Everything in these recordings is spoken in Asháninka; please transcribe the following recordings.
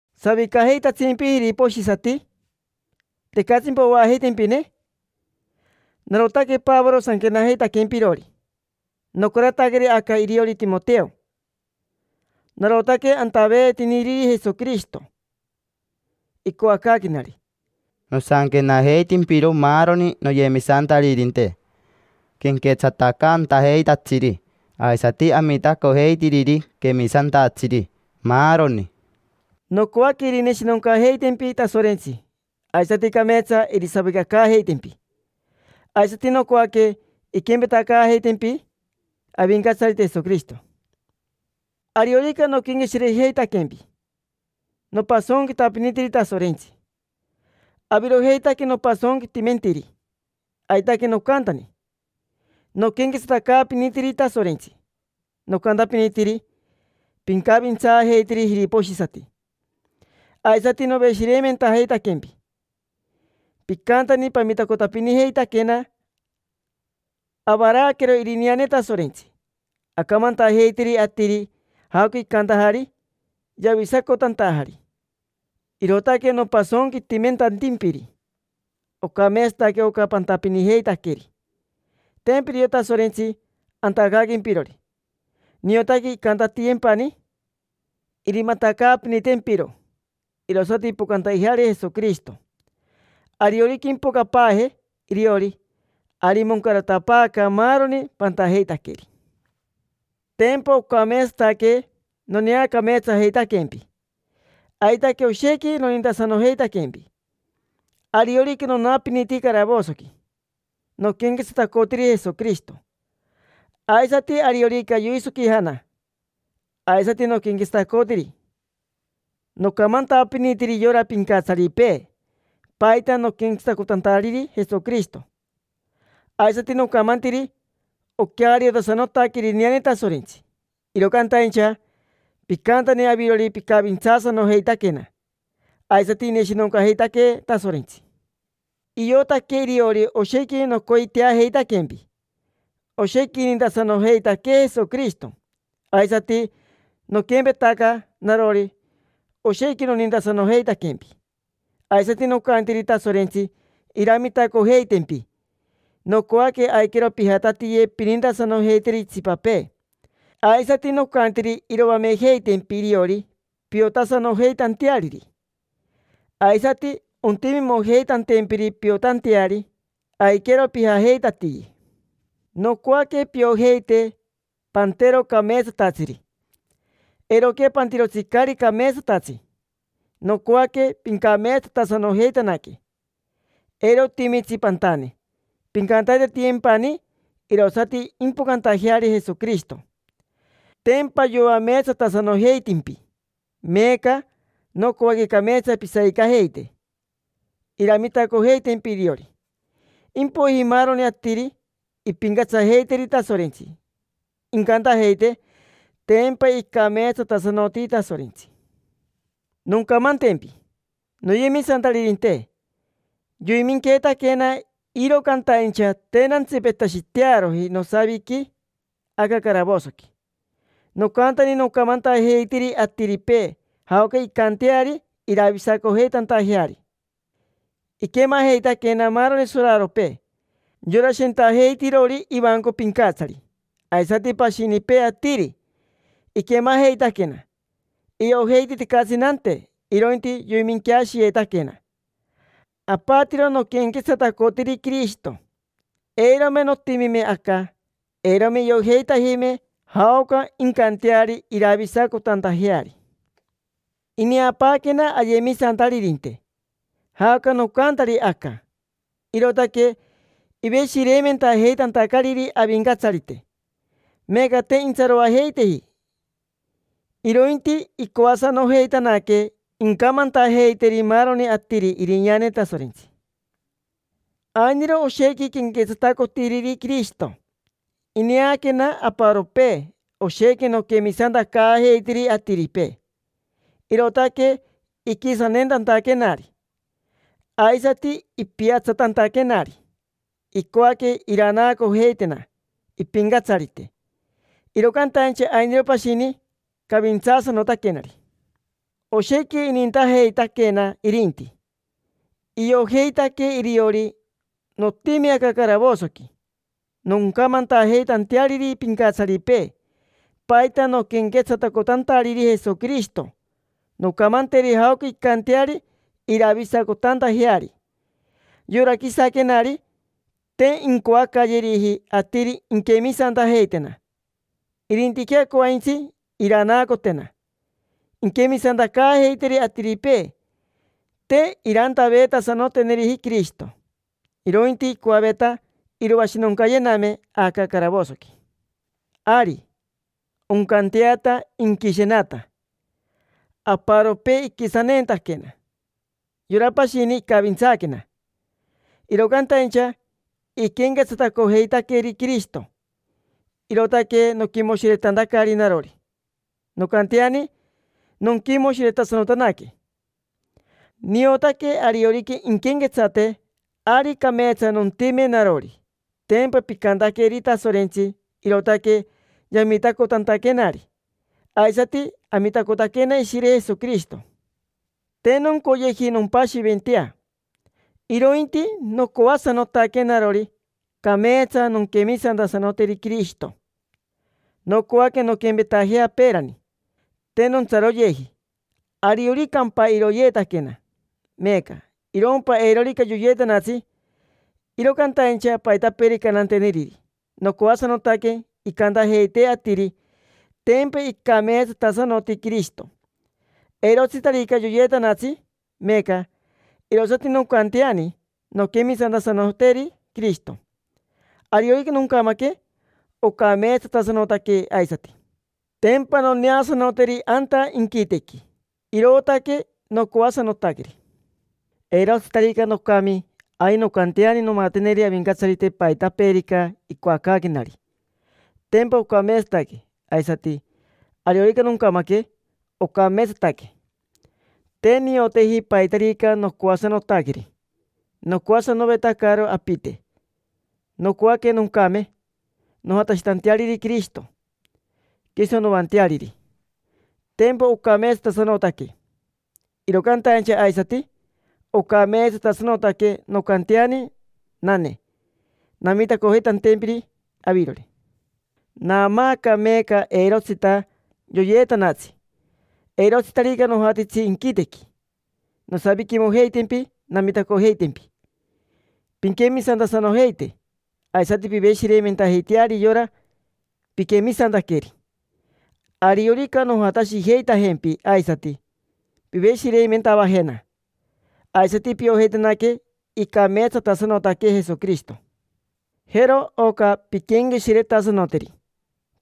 ¿Savicajeitatsimpi jiriposhisati? ¿Tecatsimpa oajeitempine? Narotaque Pavoro sanquenajeitaquempirori, nocarataqueri aca iriori Timoteo. Narotaque antaveetiniriri Jesoquirishito icoacaaquenari. Nosanquenajeitimpiro maaroni noyemisantaririnte: quenquetsatacantajeitatsiri aisati amitacojeitiriri quemisantatsiri, maaroni. Nocoaque irineshinoncajeitempi Tasorentsi, aisati cameetsa irisavicacaajeitempi. Aisati nocoaque inquempetacaajeitempi Avincatsarite Jesoquirishito. Ariorica noquenqueshirejeitaquempi, nopasonquitapinitiri Tasorentsi. Avirojeitaque nopasonquitimentiri. Aitaque nocantani noquenquetsatacaapinitiri Tasorentsi, nocantapinitiri: “Pincavintsaajeiteri jiriposhisati”, aisati noveshireimentajeitaquempi. Picantani pamitacotapinijeitaquena avaraaquero irineane Tasorentsi, acamantajeitiri atiri jaoca icantajari yavisacotantajari. Irootaque nopasonquitimentantimpiri. Ocameetsataque oca pantapinijeitaqueri, tempa irio Tasorentsi antacaaquempirori. Niotaque incantatiyempani, irimatacaapinitempiro, irosati impocantajeari Jesoquirishito. Ariorica impocapaaje iriori, ari moncaratapaaca maaroni pantajeitaqueri. Tempa ocameetsataque noneacameetsajeitaquempi, aitaque oshequi nonintasanojeitaquempi. Ariorica nonapiniti caravosoqui, noquenquetsatacotiri Jesoquirishito, aisati ariorica yoisoquijana, aisati noquenquetsatacotiri. Nocamantapinitiri yora pincatsaripee paita noquenquetsatacotantariri Jesoquirishito; aisati nocamantiri oqueariotasanotaque irineane Tasorentsi. Iro cantaincha picantani avirori picavintsaasanojeitaquena, aisati ineshinoncajeitaquee Tasorentsi. Iotaque iriori oshequi nocoiteajeitaquempi. Oshequi inintasanojeitaquee Jesoquirishito, aisati noquempetaca narori, oshequi nonintasanojeitaquempi. Aisati nocantiri Tasorentsi iramitacojeitempi, nocoaque aiquero pijatatiye pinintasanojeiteri itsipapee. Aisati nocantiri iroamejeitempi iriori piotasanojeitanteariri, aisati ontimimojeitantempiri piotanteari: aiquero pijajeitatiye. Nocoaque piojeite pantero cameetsatatsiri, eiroquea pantirotsi caari cameetsatatsi. Nocoaque pincameetsatasanojeitanaque, eiro otimitsi pantane; pincantaitatiyempani, irosati impocantajeari Jesoquirishito. Tempa yoameetsatasanojeitimpi, meeca nocoaque cameetsa pisavicajeite, iramitacojeitempi iriori. Impoiji maaroni atiri impincatsajeiteri Tasorentsi, incantajeite: “Tempa icameetsatasanoti Tasorentsi”. Noncamantempi, noyemisantaririnte: yoiminqueetaquena, iro cantaincha te nantsipetashitearoji nosaviqui aca caravosoqui. Nocantani nocamantajeitiri atiripee jaoca incanteari iravisacojeitantajeari. Iquemajeitaquena maaroni soraropee: yora shentajeitirori ivanco pincatsari. Aisati pashinipee atiri, iquemajeitaquena. Iojeiti tecatsi nante, irointi yoiminqueashiyeetaquena; apatiro noquenquetsatacotiri Quirishito. Eirome notimime aca, eirome iojeitajime jaoca incanteari iravisacotantajeari. Ineapaaquena ayemisantaririnte jaoca nocantari aca, irootaque iveshireimentajeitantacariri Avincatsarite. Meeca te intsaroajeiteji, irointi icoasanojeitanaque incamantajeiteri maaroni atiri irineane Tasorentsi. Ainiro oshequi quenquetsatacotiriri Quirishito. Ineaquena aparopee oshequi noquemisantacaajeitiri atiripee, irootaque iquisaneentantaquenari, aisati ipiatsatantaquenari; icoaque iranaacojeitena impincatsarite. Iro cantaincha ainiro pashini cavintsaasanotaquenari, oshequi inintajeitaquena irinti. Iojeitaque iriori notimi aca caravosoqui noncamantajeitanteariri pincatsaripee paita noquenquetsatacotantariri Jesoquirishito, noncamanteri jaoca incanteari iravisacotantajeari. Yora quisaquenari, te incoacayeriji atiri inquemisantajeitena, irintiquea coaintsi iranaacotena inquemisantacaajeiteri atiripee. Te irantaveetasanoteneri Quirishito, irointi icoaveta iroashinoncayename aca caravosoqui. Ari, oncanteata inquishenata. Aparopee iquisaneentaquena, yora pashini icavintsaaquena, iro cantaincha iquenquetsatacojeitaqueri Quirishito, irootaque noquimoshiretantacari narori. Noncanteani nonquimoshiretasanotanaque. Niotaque ariorica inquenquetsate, ari cameetsa nontime narori. Tempa picantaqueri Tasorentsi, irootaque yamitacotantaquenari, aisati amitacotaquena Ishire Jesoquirishito. Te noncoyeji nompashiventea, irointi nocoasanotaque narori cameetsa nonquemisantasanoteri Quirishito; nocoaque nonquempetajea peerani, te nontsaroyeji. Arioricampa iroyeetaquena meeca, irompa eirorica yoyeetanatsi, iro cantaincha paitapeerica nanteneriri, nocoasanotaque incantajeite atiri: “Tempa icameetsatasanoti Quirishito”. Eirotsitarica yoyeetanatsi meeca, irosati noncanteani nonquemisantasanoteri Quirishito. Ariorica noncamaque, ocameetsatasanotaque aisati: tempa noneasanoteri anta inquitequi; irootaque nocoasanotaqueri. Eirotsitarica nocami, ari noncanteani nomateneri Avincatsarite paitapeerica icoacaaquenari. Tempa ocameetsataque. Aisati, ariorica noncamaque, ocameetsataque. Te nioteji paitarica nocoasanotaqueri. Nocoasanovetacaro apite. Nocoaque noncame, nojatashitanteariri Quirishito, quiso noanteariri. Tempa ocameetsatasanotaque. Iro cantaincha aisati ocameetsatasanotaque noncanteani nanee, namitacojeitantempiri avirori. Naamaaca meeca eirotsita yoyeetanatsi, eirotsitarica nojatitsi inquitequi. Nosaviquimojeitempi namitacojeitempi pinquemisantasanojeite, aisati piveshireimentajeiteari yora piquemisantaqueri. Ariorica nojatashijeitajempi aisati, piveshireimentavajena, aisati piojeitanaque icameetsatasanotaque Jesoquirishito. Jero oca pinquenqueshiretasanoteri: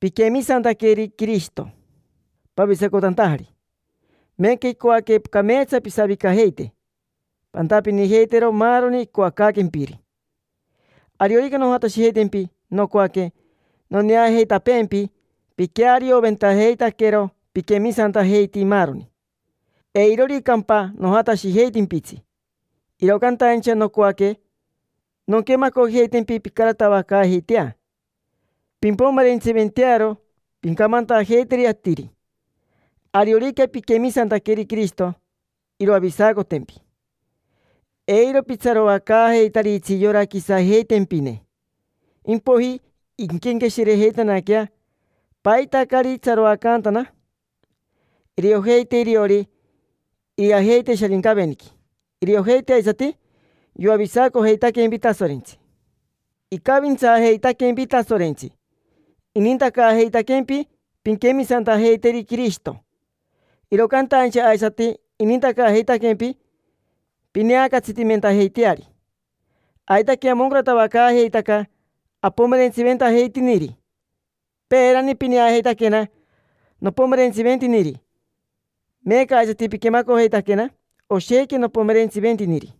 piquemisantaqueri Quirishito pavisacotantajari, meeca icoaque cameetsa pisavicajeite, pantapinijeitero maaroni icoacaaquempiri. Ariorica nojatashijeitempi nocoaque noneajeitapeempi piquearioventajeitaquero piquemisantajeiti maaroni. Eiroricampa nojatashijeitimpitsi, iro cantaincha nocoaque nonquemacojeitempi pincaratavacaajeitea, pimpomerentsiventearo pincamantajeiteri atiri: “Ariorica pinquemisanteri Quirishito, iroavisacotempi”. Eiro pitsaroacaajeitaritsi yora quisajeitempine: impoiji inquenqueshirejeitanaquea: “¿Paita caari itsaroacantana?” Iriojeite iriori irijajeite Sharincaveniqui, iriojeite aisati yoavisacojeitaquempi Tasorentsi. Icavintsaajeitaquempi Tasorentsi, inintacaajeitaquempi pinquemisantajeiteri Quirishito. Iro cantaincha aisati inintacaajeitaquempi pineacatsitimentajeiteari. Aitaque amoncaratavacaajeitaca apomerentsiventajeitiniri. Peerani pineajeitaquena nopomerentsiventiniri. Meeca aisati piquemacojeitaquena, oshequi nopomerentsiventiniri.